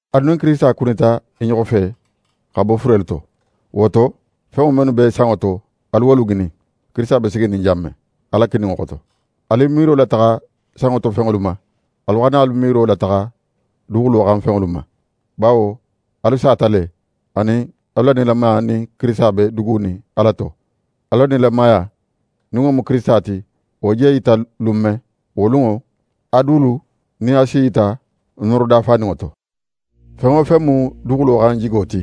Alu nin Kirisita kunita i ɲoxo fe xa bo furelu to. Wo to, fenŋo mennu be sanŋo to, alu wolu ŋinin, Kirisita be siginin jan men, Ala kininŋo xoto. Alu i miiro lataxa sanŋo to fenŋolu ma, alu xana i miiro lataxa duguxulo xan fenŋolu ma. Bawo alu sata le; anin, alu la nilamaya nin Kirisita be dugunin Ala to. Alu la nilamaya, nin wo mu Kirisita ti, wo je í yita lun men, wo lunŋo, alu dulu nin a si yita nooro dafaninŋo to. Fen wo fen mu duguxulo xan jigo ti,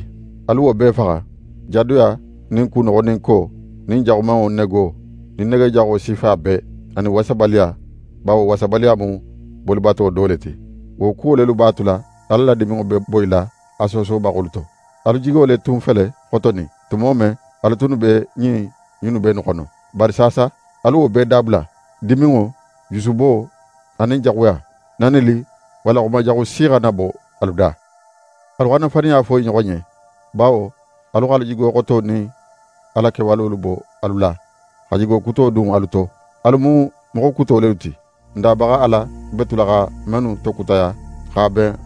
alu wo bee faxa: Jadoya nin kunoxoninko nin jaxumanŋo nego nin nege jaxo sifa bee, anin wasabaliya, bawo wasabaliya mu bolibato do le ti. Wo kuwo lelu b'a tula Ala la diminŋo be boyila a soosobaxolu to. Alu jigo le tun fele xotonin, tumo men, alu tunnu be ɲin junube innu xono. Bari saasa, alu wo bee dabula: Diminŋo, jusubo, anin jaxuya. Nanili walla xuma jaxu si xana bo alu da. Alu xana faniya fo i ɲoxo ɲen, bawo alu x'alu jigo xoto nin a la kewalolu bo alu la, xa jigo kuto dun alu to. Alu mu moxo kuto lelu ti, n Dabaxa Ala be tula xa mennu tokutaya x'a ben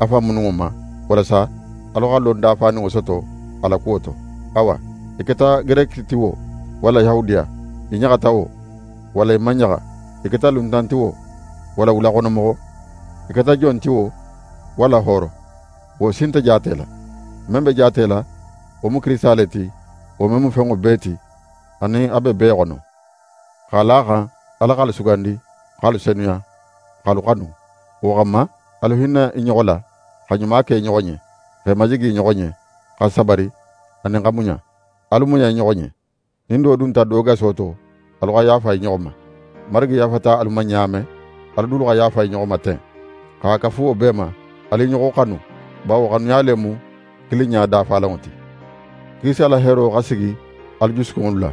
a fan mununŋo ma, walasa alu xa lon dafaninŋo soto a la kuwo to. Awa, í keta Gereki ti wo, walla Yahudiya, í ɲaxata wo, walla í man ɲaxa, í keta luntan ti wo, walla wulaxono moxo, í keta jon ti wo, walla hooro, wo si nte jaatela. Men be jaatela, wo mu Kirisita le ti, wo men mu fenŋo bee ti, anin a be bee xono. X'a la a xan Ala x'alu sugandi, x'alu senuya, x'alu xanu, wo xanma alu hinna i ɲoxo la, xa ɲuma ke i ɲoxo ɲen, x'e majigi i ɲoxo ɲen, xa sabari anin xa muɲa. Alu muɲa i ɲoxo ɲen. Nin do dunta do gaso to, alu xa yaafa i ɲoxo ma. Marigi yaafata alu ma ɲa men, alu dulu xa yaafa i ɲoxo ma ten. X'a kafu wo bee ma, alu i ɲoxo xanu, bawo xanuya le mu kilinɲa dafalanŋo ti. Kirisita la heero xa sigi alu jusukunŋolu la.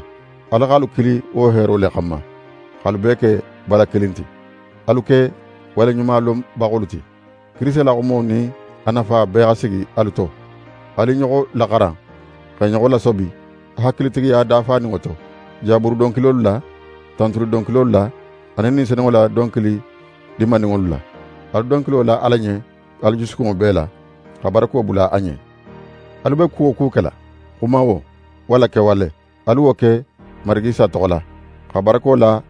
Ala x'alu kili wo heero le xanma, x'alu bee ke bala kilin ti. Alu ke waleɲuma lonbaxolu ti. Kirisita la xumo nin a nafa bee xa sigi alu to. Alu i ɲoxo laxaran, x'e ɲoxo lasobi hakilitigiya dafaninŋo to, Jaburu donkilolu la, tantuli donkilolu la, anin Ni Senunŋo la donkili dinmaninŋolu la. Alu donkilo la Ala ɲen alu jusukunŋo bee la, xa barako bula a ɲen. Alu be ku wo ku kela, xuma wo, walla kewale, alu wo ke Marigi Isa toxo la, xa barako la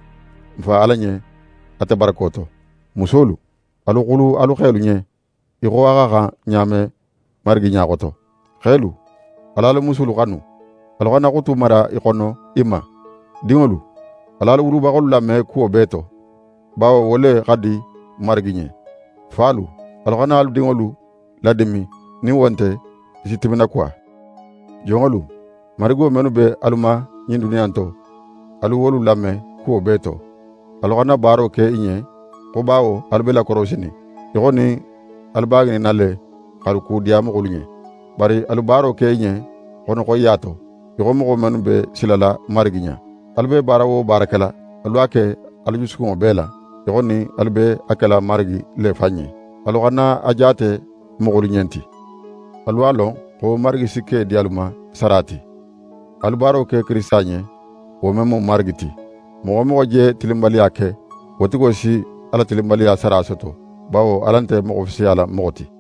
n Fa Ala ɲen ate barako to. Musolu, alu xulu alu xelu ɲen í xo a xa xan ɲa men Marigi ɲa xoto. Xelu, al'alu musulu xanu, alu xana xutu mara í xono i ma. Dinŋolu, al'alu wulubaxolu lame kuwo bee to, bawo wo le xa di Marigi ɲen. Falu, alu xana alu dinŋolu ladimin, nin wo nte, i si timinakuwa. Jonŋolu, marigo mennu be alu ma ɲin duniya in to, alu wolu lame kuwo bee to. Alu xana baaro ke i ɲen xo bawo alu be lakorosinin, í xo nin alu b'a ŋininna le x'alu kudiya moxolu ɲen. Bari alu baaro ke i ɲen xono xoyiya to, í xo moxo mennu be silala Marigi ɲa. Alu be baara wo baara kela, alu a ke alu jusukunŋo bee la, í xo nin alu be a kela Marigi le fan ɲen. Alu xana a jaate moxolu ɲen ti. Alu a lon xo Marigi si ke di alu ma sara ti. Alu baaro ke Kirisita ɲen, wo men mu Marigi ti. Moxo wo moxo je tilinbaliya ke, wo tigo si a la tilinbaliya sara soto, bawo Ala nte moxo fisiyala moxo ti.